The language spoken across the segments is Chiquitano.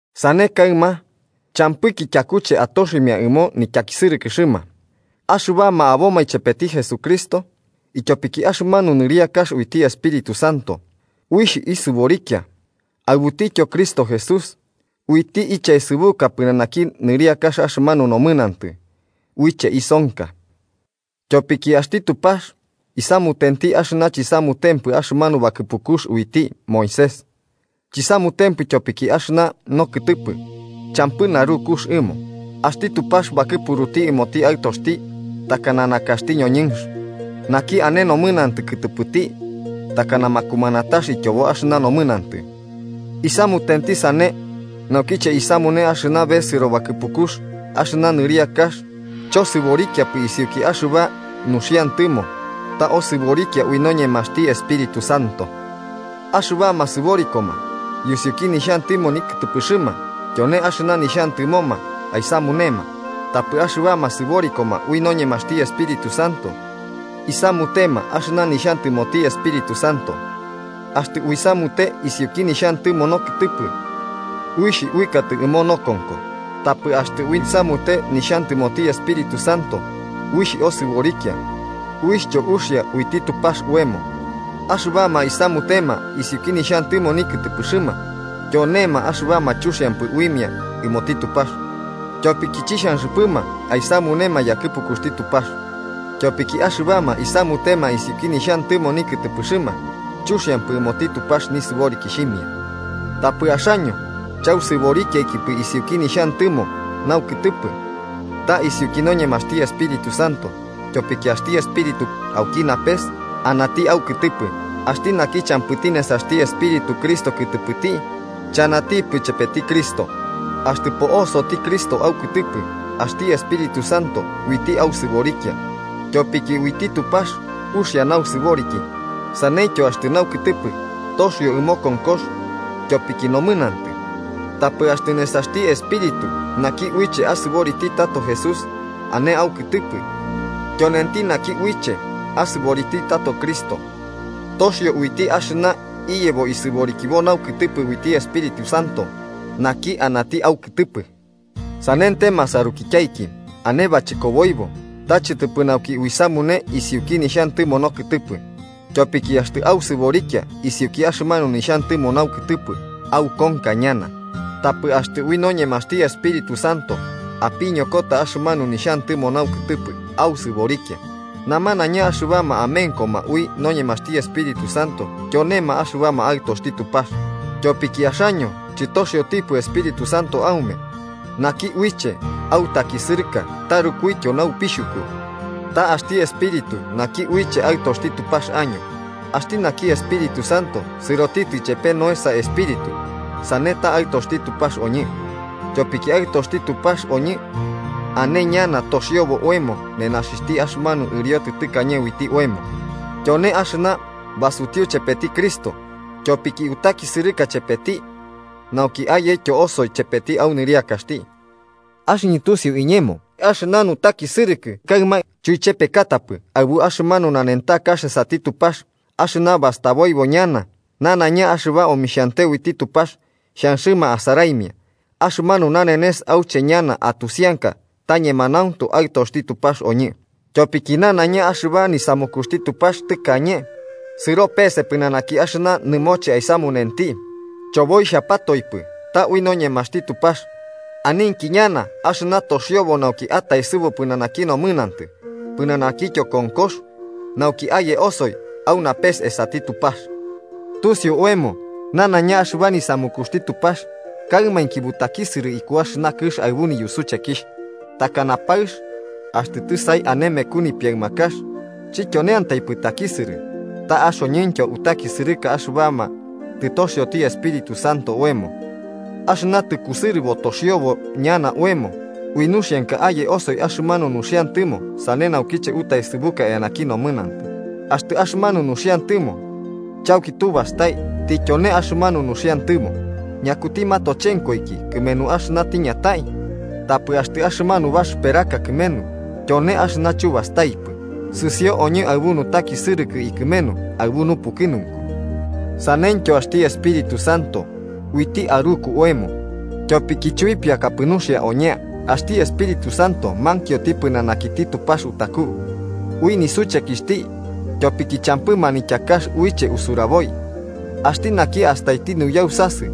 Sane kaɨma, champɨki tyakuche atoximia ɨmo nityakisɨrɨkɨxɨma axɨbama aboma ichepeti Jesucristo, tyopiki axɨmanu nɨriakax uiti Espíritu Santo uixh isɨborikia aɨbuti Cristo Jesús, uiti ichaesɨbuka pɨnanaki nɨriaka axɨmanu nomɨnantɨ uiche isonka. Tyopiki axti Tupax isamutenti axɨna chisamutempɨ axɨmanu bakɨpukux uiti Moisés, chisamutempɨ ityopiki axɨna nokɨtɨpɨ champɨ narukux ɨmo. Axti Tupax bakɨpuruti ɨmoti Aɨtoxti takana nakaxti ñoñɨnx naki ane nomɨnantɨ kɨtɨpɨti takana makumanatax ityobo axɨna nomɨnantɨ. Isamutenti sane nauki uisamune axɨna besɨro yakɨpukux axɨna nɨriakax, chosɨborikiaikipɨ isiuki axɨba nuxiantɨmo ta osɨborikia ui noñemaxti Espíritu Santo. Axɨbama sɨborikoma yusiuki nixhantɨmo nikɨtɨpɨxɨma, tyone axɨna nixhantɨmoma aisamunema. Tapɨ axɨbama sɨborikoma ui noñemaxti Espíritu Santo, isamutema axɨna nixhantɨmoti Espíritu Santo. Axtɨ uisamute isiuki nixhantɨmo nokɨtɨpɨ, uixh uɨkatɨ ɨmo nokonko. Tapɨ axtɨ uisamute nixhantɨmoti Espíritu Santo uixh osɨborikia uixhtyo uxia uiti Tupax oemo. Axɨbama isamutema isiuki nixhantɨmo nikɨtɨpɨxɨma tyonema axɨbama chuxiampɨ uimia ɨmoti Tupax, tyopiki chixhanxɨpɨma aisamunema yakɨpukuxti Tupax. Tyopiki axɨbama isamutema isiuki nixhantɨmo nikɨtɨpɨxɨma chuxiampɨ ɨmoti Tupax nisɨborikixhimia. Tapɨ axaño chausɨborikiaikipɨ isiuki nixhantɨmo naukɨtɨpɨ, ta isiuki noñemaxti Espíritu Santo, tyopiki axti Espíritu auki napes anati aukɨtɨpɨ. Axti naki champɨti nesaxti Espíritu Cristo kɨtɨpɨti, chanatipɨ chepeti Cristo. Axtɨ po'osoti Cristo aukɨtɨpɨ, axti Espíritu Santo uiti ausɨborikia tyopiki uiti Tupax uxia nausɨboriki, saneityo axtɨ naukɨtɨpɨ toxio ɨmo konkox tyopiki nomɨnantɨ. Tapɨ axtɨ nesaxti Espíritu naki uiche asɨboriti tato Jesús ane aukɨtɨpɨ, tyonenti naki uiche asɨboriti tato Cristo toxio uiti axɨna iyebo isɨborikibo naukɨtɨpɨ uiti Espíritu Santo naki anati aukɨtɨpɨ. Sanente masarukityaiki, ane bachɨkoboibo, ta chɨtɨpɨ nauki uisamune isiuki nixhantɨmo nokɨtɨpɨ. Tyopiki axtɨ ausɨborikia isiuki axɨmanu nixhantɨmo naukɨtɨpɨ, aukonka ñana. Tapɨ axtɨ ui noñemaxti Espíritu Santo apiñokota axɨmanu nixhantɨmo naukɨtɨpɨ, ausɨborikia. Namanaiña axɨbama amenkoma ui noñemaxti Espíritu Santo, tyonema axɨbama aɨtoxti Tupax. Tyopiki axaño chɨtoxiotipɨ Espíritu Santo aume naki uiche autakisɨrɨka tarukuityo naupixhuku, ta axti Espíritu naki uiche aɨtoxti Tupax año. Axti naki Espíritu Santo sɨroti ichepe noesa espíritu, sane ta aɨtoxti Tupax oñɨ. Tyopiki aɨtoxti Tupax oñɨ, ane ñana toxiobo oemo nenaxixhti axɨmanu ɨriotɨ tɨkañe uiti oemo tyone axɨna basutiu chepeti Cristo, tyopiki utakisɨrɨka chepeti nauki ayetyo osoi chepeti au nɨriakaxti. Axɨñɨ tusiu iñemo, axɨna nutakisɨrɨkɨ kaɨma, chuichepekatapɨ aɨbu axɨmanu nanentakax esati Tupax axɨna bastaboibo ñana. Nanaiña axɨba omixhiante uiti Tupax xhanxɨma asaraimia axɨmanu nanenes auche ñana atusianka ta ñemanauntu aɨtoxti Tupax oñɨ. Tyopiki nanaiña axɨba nisamukuxti Tupax tɨkañe, sɨro pese pɨnanaki axɨna nɨmoche aisamunenti, choboixhapatoipɨ, ta ui noñemaxti Tupax. Aninki ñana axɨna toxiobo nauki ataesɨbu pɨnanaki nomɨnantɨ pɨnanakityo konkox, nauki aye osoi au napes esati Tupax. Tusiu oemo nanaiña axɨba nisamukuxti Tupax kaɨmainki butakisɨrɨ iku axɨna kɨx aɨbu niyusuchekixh, takana paɨx axtɨ tɨsaimia ane meku nipiaɨmakax. Chityoneantaipɨ takisɨrɨ, ta axoñɨntyo utakisɨrɨka axɨbama tɨtoxioti Espíritu Santo oemo, axɨna tɨkusɨrɨbo toxiobo ñana oemo. Ui nuxianka aye osoi axɨmanu nuxiantɨmo sane naukiche utaesɨbuka eanaki nomɨnantɨ. Axtɨ axɨmanu nuxiantɨmo chauki tubastai tityone axɨmanu nuxiantɨmo, ¿ñakuti matochenkoiki kɨmenu axɨna tiñatai? Tapɨ axtɨ axɨmanu baxɨperaka kɨmenu tyone axɨna chubastaikipɨ, sɨsio oñɨ aɨbu nutakisɨrɨkɨ ikɨmenu aɨbu nupukɨnunku. Saneityo axti Espíritu Santo uiti aruku oemo. Tyopiki chuipiakapɨ nuxia oñea, axti Espíritu Santo mankioti pɨnanakiti Tupax utaku, ui nisuchekixhti ityopiki champɨ manityakax uiche usuraboi. Axti naki astaiti nuyausasɨ,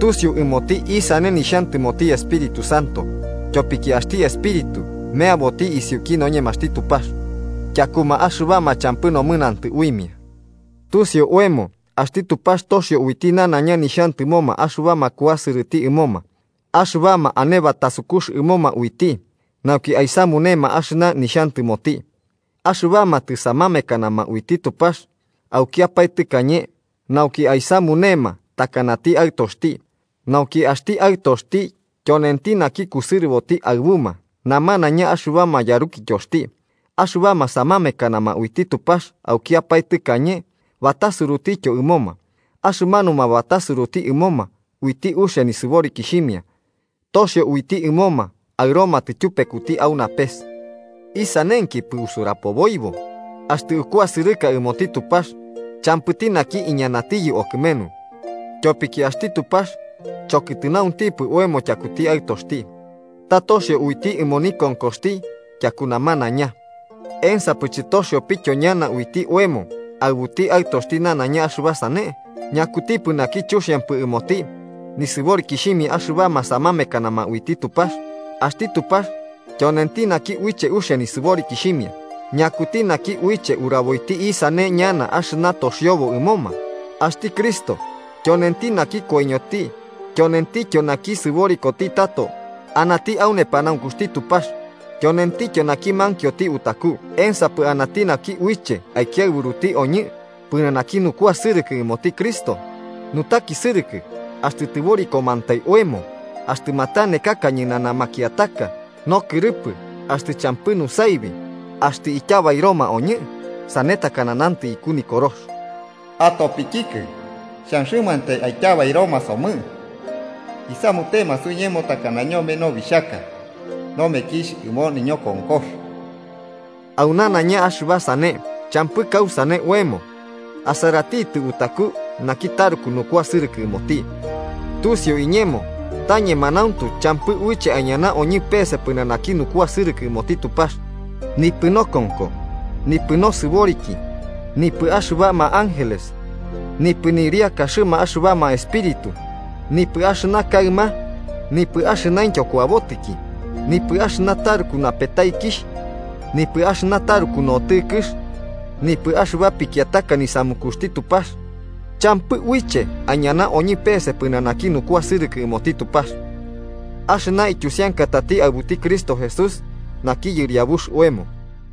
tusiu ɨmoti isane nixhantɨmoti Espíritu Santo, tyopiki axti Espíritu meaboti isiuki noñemaxti Tupax, tyakuma axɨbama champɨ nomɨnantɨ uimia. Tusiu oemo axti Tupax toxio uiti nanaiña nixhantɨmoma axɨbama kuasɨrɨti ɨmoma, axɨbama ane batasukux ɨmoma uiti nauki aisamunema axɨna nixhantɨmoti. Axɨbama tɨsamamekanama uiti Tupax aukiapae tɨkañe, nauki aisamunema takanati Aɨtoxti, nauki axti Aɨtoxti tyonenti naki kusɨrɨboti aɨbuma namanaiña axɨbama yarukityoxti. Axɨbama samamekanama uiti Tupax aukiapae tɨkañe, batasurutityo ɨmoma. Axɨmanuma batasuruti ɨmoma, uiti uxia nisɨborikixhimia, toxio uiti ɨmoma aɨromatɨ tyupekuti au napes. ¿Isanenkipɨ usurapoboibo? ¡Axtɨ ukuasɨrɨka ɨmoti Tupax, champɨti naki iñanatiyɨ okɨmenu! Tyopiki axti Tupax chokɨtɨnauntipɨ oemo tyakuti Aɨtoxti, ta toxioti uiti ɨmo nikonkoxti tyaku namanaiña, ¿ensapɨ chɨtoxiopɨtyo ñana uiti oemo aɨbuti Aɨtoxti nanaiña axɨba sane? ¿Ñakutipɨ naki chuxiampɨ ɨmoti nisɨborikixhimia axɨbama samamekanama uiti Tupax? Axti Tupax tyonenti naki uiche uxia nisɨborikixhimia. ¿Ñakuti naki uiche uraboiti isane ñana axɨna toxiobo ɨmoma? Axti Cristo tyonenti naki koiñoti. Tyonentityo naki sɨborikoti tato, anati au nepanaunkuxti Tupax, tyonentityo naki mankioti utaku. ¿Ensapɨ anati naki uiche aikiaɨburuti oñɨ pɨnanaki nukuasɨrɨkɨ ɨmoti Cristo? ¿Nutakisɨrɨkɨ, axtɨ tɨborikomantai oemo, axtɨ matanekaka ñɨnana makiataka, nokɨrɨpɨ, axtɨ champɨ nusaibi, axtɨ ityabairoma oñɨ? Sane takana nantɨ iku Nikorox: “Atopikikɨ xhanxɨmantai aityabairoma somɨ. Isamutema suiñemo takana ñome nobixhaka nomekixh ɨmo niñokonkox.” Au nanaiña axɨba sane, champɨ kausane oemo asaratitɨ utaku naki taruku nukuasɨrɨkɨ ɨmoti. Tusiu iñemo ta ñemanauntu champɨ uiche aiñana oñɨ pese pɨnanaki nukuasɨrɨkɨ ɨmoti Tupax, nipɨ nokonko, nipɨ nosɨboriki, nipɨ axɨbama ángeles, nipɨ nɨriakaxɨma axɨbama espíritu, nipɨ axɨna kaɨma, nipɨ axɨnaintyo kuabotiki, nipɨ axɨna taruku napetaikixh nipɨ axɨna taruku notɨkɨx nipɨ axɨba pikiataka nisamukuxti Tupax. ¡Champɨ uiche aiñana oñɨ pese pɨnanaki nukuasɨrɨkɨ ɨmoti Tupax axɨna ityusiankatati aɨbuti Cristo Jesús naki Yɨriabux oemo!